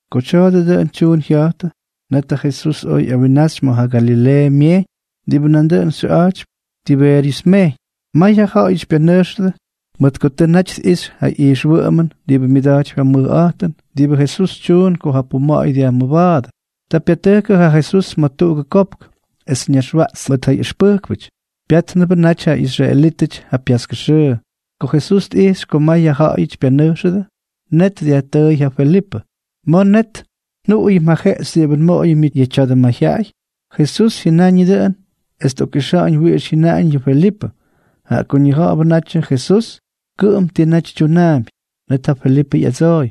Ko tya̱a̱dʉ dʉꞌʉn tyuun jya̱jtʉ, net ja Jesús oj ꞌyawinnaxy ma̱ ja Galileeʉ Myejyñ diꞌibʉ nandʉꞌʉn xyʉꞌa̱jtypy Tibeeryʉs Myejyñ. May ja ja̱ꞌa̱y pyanʉjxʉdʉ mʉt ko tʉ naty tꞌixy ja ijxwʉꞌʉmʉn diꞌibʉ myʉda̱jtypy ja mʉjꞌa̱jtʉn diꞌibʉ Jesús tyuun ko ja puma̱ꞌa̱y dyajmʉba̱a̱dʉ. Ta pyatʉjkʉ ja Jesús ma̱ tuꞌugʉ kopk, es ñaxwaꞌtstʉ mʉt ja ꞌyʉxpʉjkpʉty. Pyátnʉbʉ naty ja israelítʉty ja pyaskʉ xʉʉ. Ko Jesús tꞌijxy ko may ja ja̱ꞌa̱yʉty pyanʉjxʉdʉ, net dyajtʉʉy ja Felipʉ: —¿Ma̱ net njuꞌuyʉm yʉ jeꞌxy diꞌibʉ nmoꞌoyʉm yʉ tya̱dʉ mayjyaꞌay? Jesús jyʉnañʉ dʉꞌʉn es tꞌokꞌixa̱ꞌa̱ñ wiꞌix jyʉnaꞌañ yʉ Felipʉ, jaꞌa ko ñija̱ꞌa̱bʉ natyʉ Jesús kʉꞌʉm ti naty tyunaampy. Net ja Felipʉ ꞌyadsooy: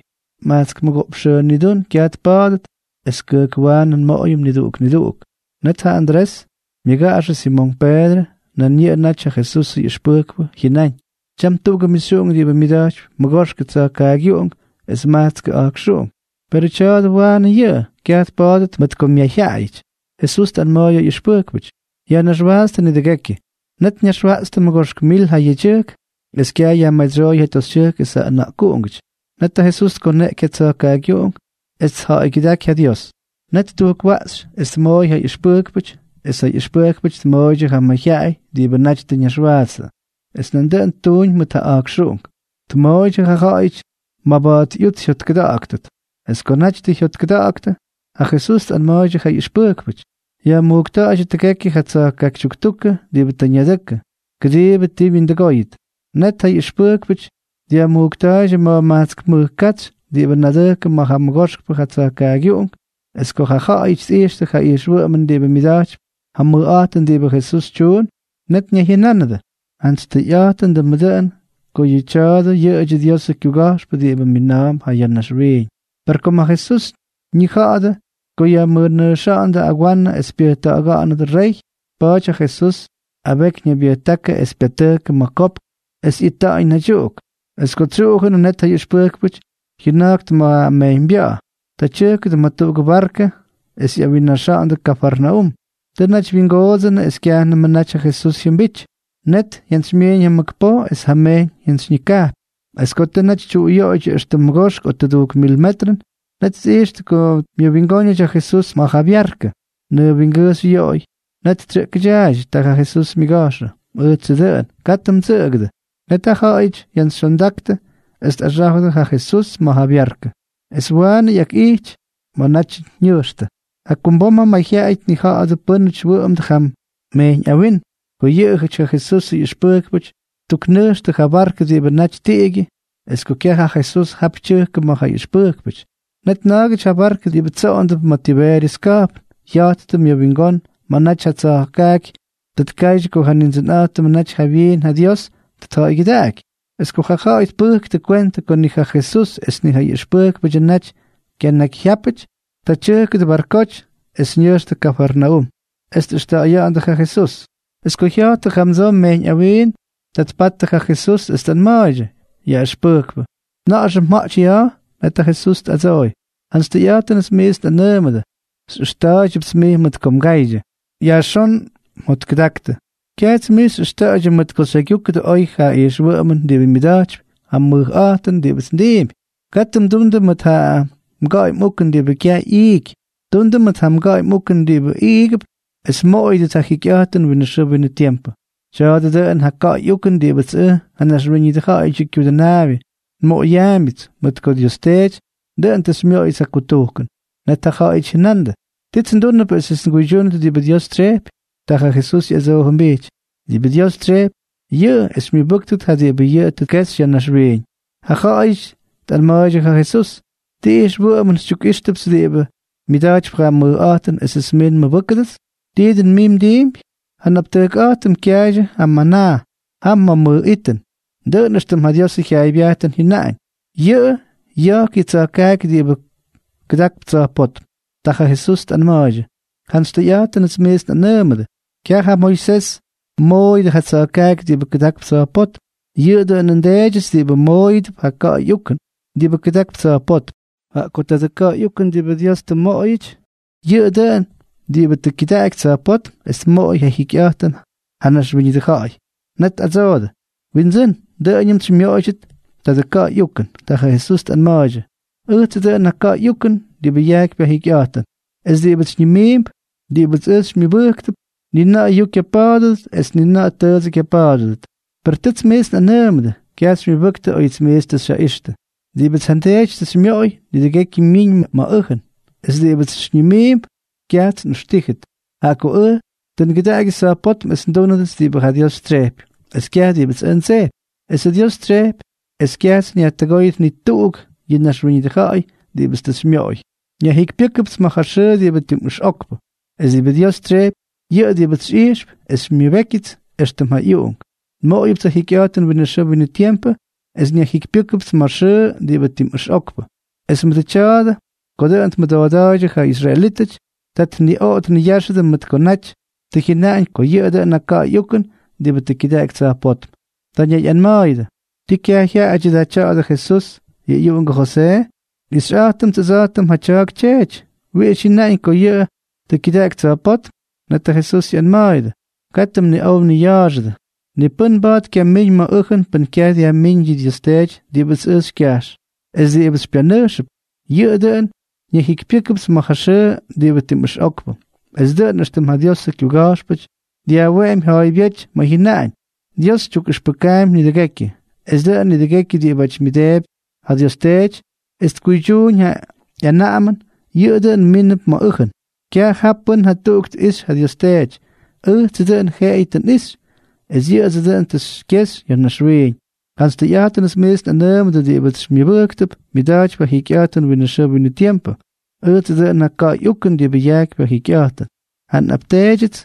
—Majtsk mʉgoꞌpx xʉʉ nidún kyaj tpa̱a̱dʉt es kʉjkwaanʉ nmoꞌoyʉm niduꞌuk niduꞌuk. Net ja Andrés, ja myʉgaꞌaxʉ Simonk Peedrʉ, nan yʉꞌʉ naty ja Jesusʉ ꞌyʉxpʉjkpʉ, jyʉnáñ: —Tyam tuꞌugʉ mixyuꞌunk diꞌibʉ myʉda̱jtypy mʉgoxkʉ tsa̱jkaagyuꞌunk es majtskʉ a̱jkxuꞌunk, perʉ tya̱a̱dʉ waanʉ yʉꞌʉ. Kyaj tpa̱a̱dʉt mʉt ko myayjyaꞌayʉty. Jesús tꞌanma̱a̱y ja ꞌyʉxpʉjkpʉty: —Yajnaxwaatstʉ nidʉgekyʉ. Net ñaxwaꞌtstʉ mʉgoxk mil ja yedyʉjkʉty, es kyaj yajmadsyóy ja toxytyʉjkʉty es ja ʉna̱ꞌkuꞌungʉty. Net ja Jesús tkoneꞌky ja tsa̱jkaagyuꞌunk es tja̱ꞌa̱ygyʉdáky ja Dios. Net ttujkwaꞌxy es tmooy ja ꞌyʉxpʉjkpʉty es ja ꞌyʉxpʉjkpʉty tmooydyʉ ja mayjyaꞌay diꞌibʉ naty tʉ ñaxwaatstʉ. Es nandʉꞌʉn ttuuñ mʉt ja a̱jkxuꞌunk, tmooydyʉ ja ja̱ꞌa̱yʉty maba̱a̱t ꞌyuts jyotkʉda̱ꞌa̱ktʉt. Es ko naty tʉ jyotkʉda̱ꞌa̱ktʉ, ja Jesús tꞌanma̱a̱ydyʉ ja ꞌyʉxpʉjkpʉty: —Yajmujkta̱ꞌa̱ydyʉ tʉgekyʉ yʉ tsa̱jkaaky tyuktukʉ diꞌibʉ tʉ ñadʉkʉ, kʉdiibʉ ti wyindʉgóyʉt. Net ja ꞌyʉxpʉjkpʉty dyajmujkta̱a̱ydyʉ ma̱jmajtsk mʉj katsy diꞌibʉ nadʉjkʉ ma̱ ja mʉgoxkpʉ ja tsa̱jkaagyuꞌungʉn. Es ko ja ja̱ꞌa̱yʉty tꞌijxtʉ ja ijxwʉꞌʉmʉn diꞌibʉ myʉda̱jtypy ja mʉjꞌa̱jtʉn diꞌibʉ Jesús tyuun, net ñayjyʉnánʉdʉ: —Jantsy tʉyꞌa̱jtʉndʉmʉ dʉꞌʉn ko yʉ tya̱a̱dʉ yʉꞌʉdyʉ Diosʉ kyuga̱jxpʉ diꞌibʉ mina̱a̱mp ya̱ naxwiiñ. Per kom ja Jesús ñija̱ꞌa̱jʉ ko jyamʉnʉjxa̱ꞌa̱nʉdʉ agwanʉ es pyʉjta̱ꞌa̱ga̱ꞌa̱nʉdʉ rey, pa̱a̱ty ja Jesús abeky ñaybyʉjtákʉ es pyatʉjkʉ ma̱ ja kopk es ita̱ꞌa̱n naydyuꞌuk. Es ko tsyuꞌujʉnʉ, net ja ꞌyʉxpʉjkpʉty jyʉna̱jktʉ ma̱ ja mejyñbya̱ꞌa̱. Ta tyʉjkʉdʉ ma̱ tuꞌugʉ barkʉ es ꞌyawinnaxa̱ꞌa̱ndʉ Kafarnaúm. Tʉ naty wyingoodsʉnʉ es kyajnʉmʉ naty ja Jesús jyʉmbity, net jyantsymyiiñ ja mʉk poj es ja mejyñ jyantsyñikapy. Es ko tʉ naty tyuꞌuyoꞌoydyʉ éxtʉm mʉgoxk o tʉdujk mil metrʉn, net tꞌijxtʉ ko myʉwingóñʉty ja Jesús ma̱ ja byarkʉ, nʉʉ wingʉjxy yoꞌoy. Net tsyʉꞌkʉdyaaydyʉ. Ta ja Jesús myʉga̱jxʉ: —Ʉjtsʉ dʉꞌʉn. Katʉ mdsʉꞌʉgʉdʉ. Net jaꞌajʉty jyantsyxyondaktʉ es tꞌaxá̱jʉdʉ ja Jesús ma̱ ja byarkʉ. Es waanʉ ꞌyakꞌijty, ta jya̱jttʉ ma̱ naty ñʉjxtʉ. Jakumbom ja mayjyaꞌay tnija̱ꞌa̱dʉ pʉ́nʉty wʉꞌʉmdʉ jam mejyñ awinm, ko yʉꞌʉyʉty ja Jesusʉ ꞌyʉxpʉjkpʉty ttuknʉjxtʉ ja barkʉ diꞌibʉ naty tiꞌigyʉ, es ko kyaj ja Jesús jap tyʉjkʉ mʉʉt ja ꞌyʉxpʉjkpʉty. Net na̱a̱gʉty ja barkʉ diꞌibʉ tsoꞌondʉp ma̱ Tibeeryʉs ka̱jpn, jya̱jttʉ mʉwingón ma̱ naty ja tsa̱jkaaky tʉ tkaydyʉ ko ja Nindsʉnꞌa̱jtʉmʉ naty jawyiin ja Dios tʉ tja̱ꞌa̱ygyʉdaꞌaky. Es ko ja ja̱ꞌa̱y tpʉjktʉ kwentʉ ko ni ja Jesús es ni ja ꞌyʉxpʉjkpʉdyʉ naty kyanakyjyápʉty, ta tyʉjkʉdʉ barkoty es ñʉjxtʉ Kafarnaúm es tꞌʉxta̱ꞌa̱ya̱ꞌa̱ndʉ ja Jesús. Es ko jya̱jttʉ jamdsoo mejyñ awinm, ta tpattʉ ja Jesús es tꞌanma̱a̱ydyʉ: —Yaꞌʉxpʉjkpʉ, ¿na̱ꞌa̱xʉ mja̱ꞌty ya̱a̱? Net ja Jesús tꞌadsooy: —Jantsy tʉyꞌa̱jtʉnʉts miits nꞌanʉʉmʉdʉ, xyꞌʉxta̱a̱ydyʉpts mʉt ko mga̱a̱ydyʉ, yajxón mꞌujts mjotkʉdaktʉ. Kyajts mij xyꞌʉxta̱ꞌa̱ydyʉ mʉt ko xyjaygyúkʉdʉ oy ja ijxwʉꞌʉmʉn diꞌibʉ myʉda̱jtypy ja mʉjꞌa̱jtʉn diꞌibʉts ndiimpy. Katʉ mdundʉ mʉt ja mga̱ꞌa̱y mꞌukʉn diꞌibʉ kyaj ꞌyiiky. Tundʉ mʉt ja mga̱ꞌa̱y mꞌukʉn diꞌibʉ iigʉp es mmoꞌoyʉdʉt ja jikyꞌa̱jtʉn winʉ xʉʉ winʉ tiempʉ. Tya̱a̱dʉ dʉꞌʉn ja ka̱ꞌa̱y ukʉn diꞌibʉts ʉj, ja Naxwíñʉdʉ Ja̱ꞌa̱yʉdyʉ Kyudʉnaabyʉ, nmoꞌoyaambyʉts, mʉt ko Dios Teety dʉꞌʉn tʉ xymyoꞌoyʉts ja kutujkʉn. Net ja ja̱ꞌa̱yʉty jyʉnandʉ: —¿Tits ndúndʉp esʉts nguydyúnʉt diꞌibʉ Dios tsyejpy? Ta ja Jesús ꞌyadsoojʉmbijty: —Diꞌibʉ Dios tsyejpy, yʉꞌʉ es xymyʉbʉ́ktʉt ja diꞌibʉ yʉꞌʉ tʉ tkexy ya̱ naxwiiñ. Ja ja̱ꞌa̱yʉty tꞌanma̱a̱ydyʉ ja Jesús: —¿Ti ijxwʉꞌʉmʉn xytyukꞌíxtʉpts diꞌibʉ myʉda̱jtypy ja mʉjꞌa̱jtʉn esʉts mij nmʉbʉ́ktʉdʉts? ¿Tii dʉn mij mdiimpy? Ja nꞌaptʉjkꞌa̱jtʉm kyaaydyʉ ja manaa jam ma̱ mʉj itʉn, dʉꞌʉn éxtʉm ja Diosʉ jyaaybyajtʉn jyʉnaꞌañ: “Yʉꞌʉ ya̱jk yʉ tsa̱jkaaky diꞌibʉ kʉdakp tsa̱jpótm.” Ta ja Jesús tꞌanma̱a̱ydyʉ: —Jantsy tʉyꞌa̱jtʉnʉts miits nꞌanʉʉmʉdʉ, kyaj ja Moisés mmooyʉdʉ ja tsa̱jkaaky diꞌibʉ kʉdakp tsa̱jpótm, yʉꞌʉ dʉꞌʉn nDeedyʉts diꞌibʉ mmooyʉdʉp ja ka̱ꞌa̱y ukʉn diꞌibʉ kʉdakp tsa̱jpótm. Jaꞌa ko tadʉ ka̱ꞌa̱y ukʉn diꞌibʉ Dios tʉ mmoꞌoyʉty, yʉꞌʉ dʉꞌʉn diꞌibʉ tʉ kyʉdaꞌaky tsa̱jpótm es tmoꞌoy ja jikyꞌa̱jtʉn ja naxwíñʉdʉ ja̱ꞌa̱y. Net tꞌadsoodʉ: —Windsʉ́n, dʉꞌʉñʉmts xymyoꞌoydyʉt tadʉ ka̱ꞌa̱y ukʉn. Ta ja Jesús tꞌanma̱a̱ydyʉ: —Ʉjtsʉ dʉꞌʉn ja ka̱ꞌa̱y ukʉn diꞌibʉ yajkypy ja jikyꞌa̱jtʉn, es diꞌibʉts xyñimiimp, diꞌibʉts ʉj xymyʉbʉjkp, ni na̱ꞌa̱ yuu kyapa̱a̱dʉdʉt es ni na̱ꞌa̱ tʉʉdsʉ kyapa̱a̱dʉdʉt. Per tʉts miits nꞌanʉʉmʉdʉ, kyaj xymyʉbʉktʉ óyʉts miits tʉ xyjaꞌixtʉ. Diꞌibʉts ja nDeety tʉ xymyoꞌoy, nidʉgekyʉ myiñ ma̱ ʉjʉn. Es diꞌibʉts xyñimiimp, kyajts nꞌʉxtíjʉt. Jaꞌa ko ʉj tʉ ngʉdaꞌagyʉts tsa̱jpótm es ndúnʉdʉts diꞌibʉ ja Dios tsyejpy, es kyaj diꞌibʉts ʉj ndsejpy. Esʉ Dios tsyejpy es kyajts nyajtʉgóyʉt ni tuꞌuk yʉ naxwíñʉdʉ ja̱ꞌa̱y diꞌibʉts tʉ xymyoꞌoy. Nyajjikypyʉ́kʉpts ma̱ ja xʉʉ diꞌibʉ tim ʉxꞌokpʉ. Es diꞌibʉ Dios tsyejpy, yʉꞌʉ diꞌibʉts xyꞌijxp es xymyʉbékyʉts éxtʉm ja ꞌyUꞌunk, nmoꞌoyʉpts ja jikyꞌa̱jtʉn winʉ xʉʉ winʉ tiempʉ es nyajjikypyʉ́kʉpts ma̱ ja xʉʉ diꞌibʉ tim ʉxꞌokpʉ. Es mʉdʉ tya̱a̱dʉ ko dʉꞌʉn tmʉdooda̱a̱ydyʉ ja israelítʉty, ta tniꞌoꞌo tniyáxʉdʉ mʉt ko naty tʉ jyʉnaꞌañ ko yʉꞌʉ dʉꞌʉn ja ka̱ꞌa̱y ukʉn diꞌibʉ tʉ kyʉdaꞌaky tsa̱jpótm. Ta ñayꞌanma̱a̱yʉdʉ: —¿Tii kyaj jyaꞌajʉdyʉ tya̱dʉ Jesús, ja ꞌyuꞌungʉ Josee? Nꞌixyꞌa̱jtʉmts ʉdsa̱jtʉm yʉ tya̱a̱k tyeety. ¿Wiꞌix jyʉnaꞌañ ko yʉꞌʉ tʉ kyʉdaꞌaky tsa̱jpótm? Net ja Jesús ꞌyanma̱a̱yʉdʉ: —Katʉ mniꞌow mniya̱a̱xʉdʉ. Ni pʉ́n mba̱a̱t kyamíñ ma̱ ʉjʉn pʉn kyaj dyajmíñ yʉ Dios Teety diꞌibʉts ʉj xykyajx. Es diꞌibʉts xypyanʉjxp, yʉꞌʉ dʉꞌʉn nyajjikypyʉ́kʉpts ma̱ ja xʉʉ diꞌibʉ tim ʉxꞌokpʉ. Es dʉꞌʉn éxtʉm ja Diosʉ kyuga̱jxpʉty dyajweꞌemy ja̱a̱ybyéty ma̱ jyʉnaꞌañ: “Dios tyukꞌʉxpʉkaampy nidʉgekyʉ.” Es dʉꞌʉn nidʉgekyʉ diꞌibʉty myʉmʉdeepy ja Dios Teety es tkuydyúñ ja ꞌyanaꞌamʉn, yʉꞌʉ dʉꞌʉn mínʉp ma̱ ʉjʉn. ’Kyaj jaa pʉ́n jatuꞌuk tꞌixy ja Dios Teety. Ʉjtsʉ dʉꞌʉn jeꞌeyʉ tʉ nꞌixy, es yʉꞌʉdsʉ dʉꞌʉn tʉ xykyexy ya̱ naxwiiñ. Jantsy tʉyꞌa̱jtʉnʉts miits nꞌanʉʉmʉdʉ, diꞌibʉts xymyʉbʉjkp, myʉda̱jtypy ja jikyꞌa̱jtʉn winʉ xʉʉ winʉ tiempʉ. Ʉjtsʉ dʉꞌʉn ja ka̱ꞌa̱y ukʉn diꞌibʉ yajkypy ja jikyꞌa̱jtʉn. Ja mꞌapteedyʉty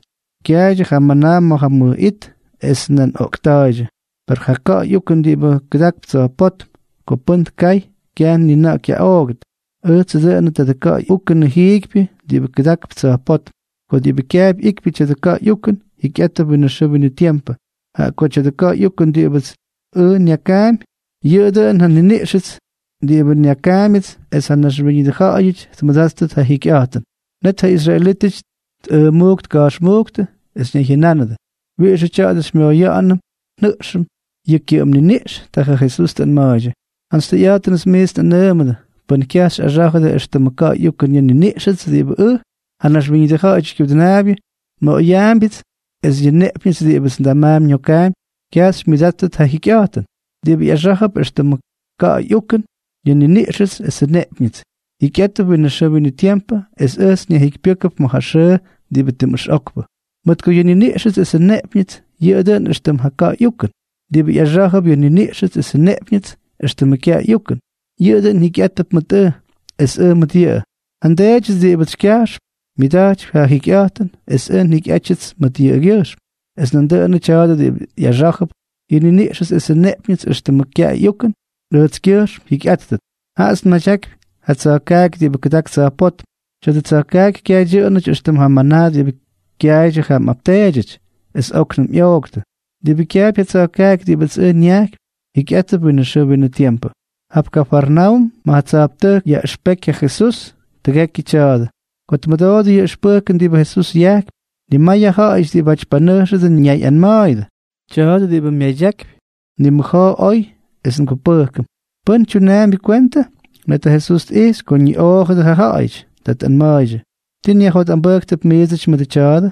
kyaaydyʉ ja manaa ma̱ ja mʉj it, es nan oꞌkta̱a̱ydyʉ, per ja ka̱ꞌa̱y ukʉn diꞌibʉ kʉdakp tsa̱jpótm, ko pʉ́n tkay, kyaj ni na̱ꞌa̱ kyaꞌooktʉt. Ʉjtsʉ dʉꞌʉnʉ tadʉ ka̱ꞌa̱y ukʉnʉ jiikypyʉ diꞌibʉ kʉdak tsa̱jpótm. Ko diꞌibʉ kyaapy ꞌyikypy tya̱dʉ ka̱ꞌa̱y ukʉn, jikyꞌátʉp winʉ xʉʉ winʉ tiempʉ. Jaꞌa ko tya̱dʉ ka̱ꞌa̱y ukʉn diꞌibʉts ʉj nyakaampy, yʉꞌʉ dʉꞌʉn ja nniniꞌxʉts diꞌibʉ nyakaambyʉts es ja naxwíñʉdʉ ja̱ꞌa̱yʉty tmʉdáttʉt ja jikyꞌa̱jtʉn. Net ja israelítʉty tꞌʉmujk tka̱jxmujktʉ es ñayjyʉnánʉdʉ: —¿Wiꞌixʉ tya̱a̱dʉ xymyoꞌoya̱ꞌa̱nʉm njʉꞌxʉm yʉ kyʉꞌʉm niniꞌx? Ta ja Jesús tꞌanma̱a̱ydyʉ: —Jantsy tʉyꞌa̱jtʉnʉts miits nꞌanʉʉmʉdʉ, pʉn kyaj xyꞌaxa̱jʉ éxtʉmʉ ka̱ꞌa̱y ukʉn yʉ nniniꞌxʉts, diꞌibʉ ʉj, ja Naxwíñʉdʉ Ja̱ꞌa̱yʉdyʉ Kyudʉnaabyʉ, nmoꞌoyaambyʉts, es yʉ nneꞌpyñʉts diꞌibʉts ndamaampy nyokaampy, kyaj xymyʉdáttʉt ja jikyꞌa̱jtʉn. Diꞌibʉ ꞌyaxá̱jʉp éxtʉmʉ ka̱ꞌa̱y ukʉn yʉ nniniꞌxʉts esʉ nneꞌpyñʉts, jikyꞌátʉp winʉ xʉʉ winʉ tiempʉ es ʉjts nyajjikypyʉ́kʉp ma̱ ja xʉʉ diꞌibʉ tim ʉxꞌokpʉ. Mʉt ko yʉ nniniꞌxʉts esʉ nneꞌpyñʉts, yʉꞌʉ dʉꞌʉn éxtʉm ja ka̱ꞌa̱y ukʉn. Diꞌibʉ ꞌyaxá̱jʉp yʉ nniniꞌxʉts esʉ nneꞌpyñʉts éxtʉmʉ kyaꞌay ꞌyukʉn, yʉꞌʉ dʉꞌʉn jikyꞌátʉp mʉt ʉj, es ʉj mʉt yʉꞌʉ. Ja nDeedyʉts diꞌibʉts xykyajxp, myʉda̱jtypy ja jikyꞌa̱jtʉn, es ʉj njikyꞌátyʉts mʉt yʉꞌʉgyʉjxm. Es nandʉꞌʉnʉ tya̱a̱dʉ diꞌibʉ ꞌyaxá̱jʉp yʉ nniniꞌxʉts esʉ nneꞌpyñʉts éxtʉmʉ kyaꞌay ꞌyukʉn, ʉjtskyʉjxm jyikyꞌátʉt. Jaꞌats nmadyakypy ja tsa̱jkaaky diꞌibʉ kʉdak tsa̱jpótm. Tya̱dʉ tsa̱jkaaky kyaj dyʉꞌʉnʉty éxtʉm ja manaa diꞌibʉ kyaaydyʉ ja mꞌapteedyʉty es óknʉm ꞌyoꞌktʉ. Diꞌibʉ kyaapy ja tsa̱jkaaky diꞌibʉts ʉj nyajkypy, jikyꞌátʉp winʉ xʉʉ winʉ tiempʉ. Jap Kafarnaúm ma̱ ja tsa̱jptʉjk yaꞌʉxpejky ja Jesús tʉgekyʉ tya̱a̱dʉ. Ko tmʉdoodʉ yʉ ʉxpʉjkʉn diꞌibʉ Jesús yajkypy, nimay ja ja̱ꞌa̱yʉty diꞌibáty panʉjxʉdʉ ñayꞌanma̱a̱yʉdʉ: —Tya̱a̱dʉ diꞌibʉ myadyakypy, nimʉja̱a̱ oy es ngupʉjkʉm. ¿Pʉ́n tyunaambyʉ kwentʉ? Net ja Jesús tꞌijxy ko ñiꞌoojʉdʉ ja ja̱ꞌa̱yʉty. Ta tꞌanma̱a̱ydyʉ: —¿Tii nyajjotꞌambʉjktʉp miidsʉty mʉdʉ tya̱a̱dʉ?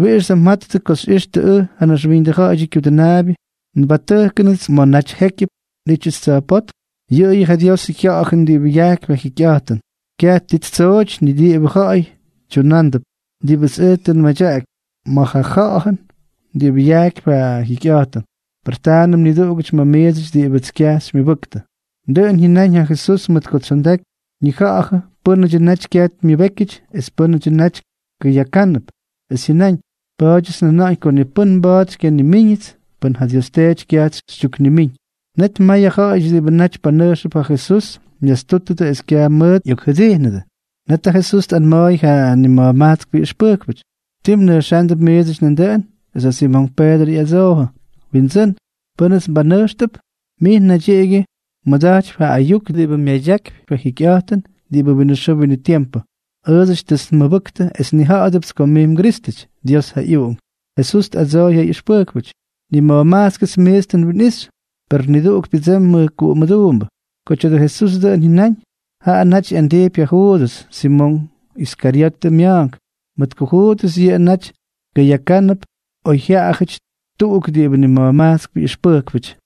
¿Wiꞌixʉ da mjattʉ ko xyꞌíxʉt ʉj, ja Naxwíñʉdʉ Ja̱ꞌa̱yʉdyʉ Kyudʉnaabyʉ, nbatʉjkʉnʉt ma̱ naty jékyʉp nꞌítyʉts tsa̱jpótm? Yʉꞌʉyʉ ja Diosʉ Jya̱ꞌa̱jʉn diꞌibʉ yajkypy ja jikyꞌa̱jtʉn. Kyaj ti ttsooty ni ti diꞌibʉ ja̱ꞌa̱y tyunándʉp. Diꞌibʉts ʉj tʉ nmadyaꞌaky, jam tsyooñ ma̱ ja Ja̱ꞌa̱jʉn diꞌibʉ yajkypy ja jikyꞌa̱jtʉn. Per taanʉm niduꞌugʉty ma̱ miidsʉty diꞌibʉts kyaj xymyʉbʉktʉ. Dʉꞌʉn jyʉnáñ ja Jesús mʉt ko tsondaky ñija̱ꞌa̱jʉ pʉ́nʉdyʉ naty kyaj myʉbékyʉty es pʉ́nʉ naty kʉyakánʉp. Es jyʉnáñ: —Pa̱a̱dyʉts njʉna̱ꞌa̱ñ ko ni pʉ́n mba̱a̱t xykyanimíñʉts pʉn ja Dios Teety kyajts xytyuknimíñ. Net may ja ja̱ꞌa̱yʉty diꞌibʉ naty panʉjxʉp ja Jesús myastútʉdʉ es kyaj mʉt ꞌyokjʉdijnʉdʉ. Net ja Jesús tꞌanma̱a̱y ja nima̱jmajtskpʉ ꞌyʉxpʉjkpʉty: —¿Tii mnʉjxándʉp miidsʉty nandʉꞌʉn? Es ja Simonk Peedrʉ ꞌyadsoojʉ: —Windsʉ́n, ¿pʉ́nʉts nbanʉjxtʉp? Mij naydyiꞌigyʉ mmʉda̱jtypy ja ayuk diꞌibʉ myadyakypy ja jikyꞌa̱jtʉn diꞌibʉ winʉ xʉʉ winʉ tiempʉ. Ʉʉdsʉty tʉts nmʉbʉktʉ es nnija̱ꞌa̱dʉpts ko mij mGrístʉty, Dios ja ꞌyUꞌunk. Jesús tꞌadsooy ja ꞌyʉxpʉjkpʉty: —Nima̱jmajtskʉts miits tʉ nwinꞌixy, per niduꞌuk pyʉdsemy mʉjkuꞌu mʉduumbʉ. Ko tya̱dʉ Jesús dʉꞌʉn jyʉnáñ, jaꞌa naty ꞌyandijpy ja Juudʉs, Simonk Iskaryotʉ mya̱a̱nk, mʉt ko Juudʉs yʉꞌʉ naty kʉyakánʉp oy jyajaꞌajʉty tuꞌuk diꞌibʉ nima̱jmajtskpʉ ꞌyʉxpʉjkpʉty.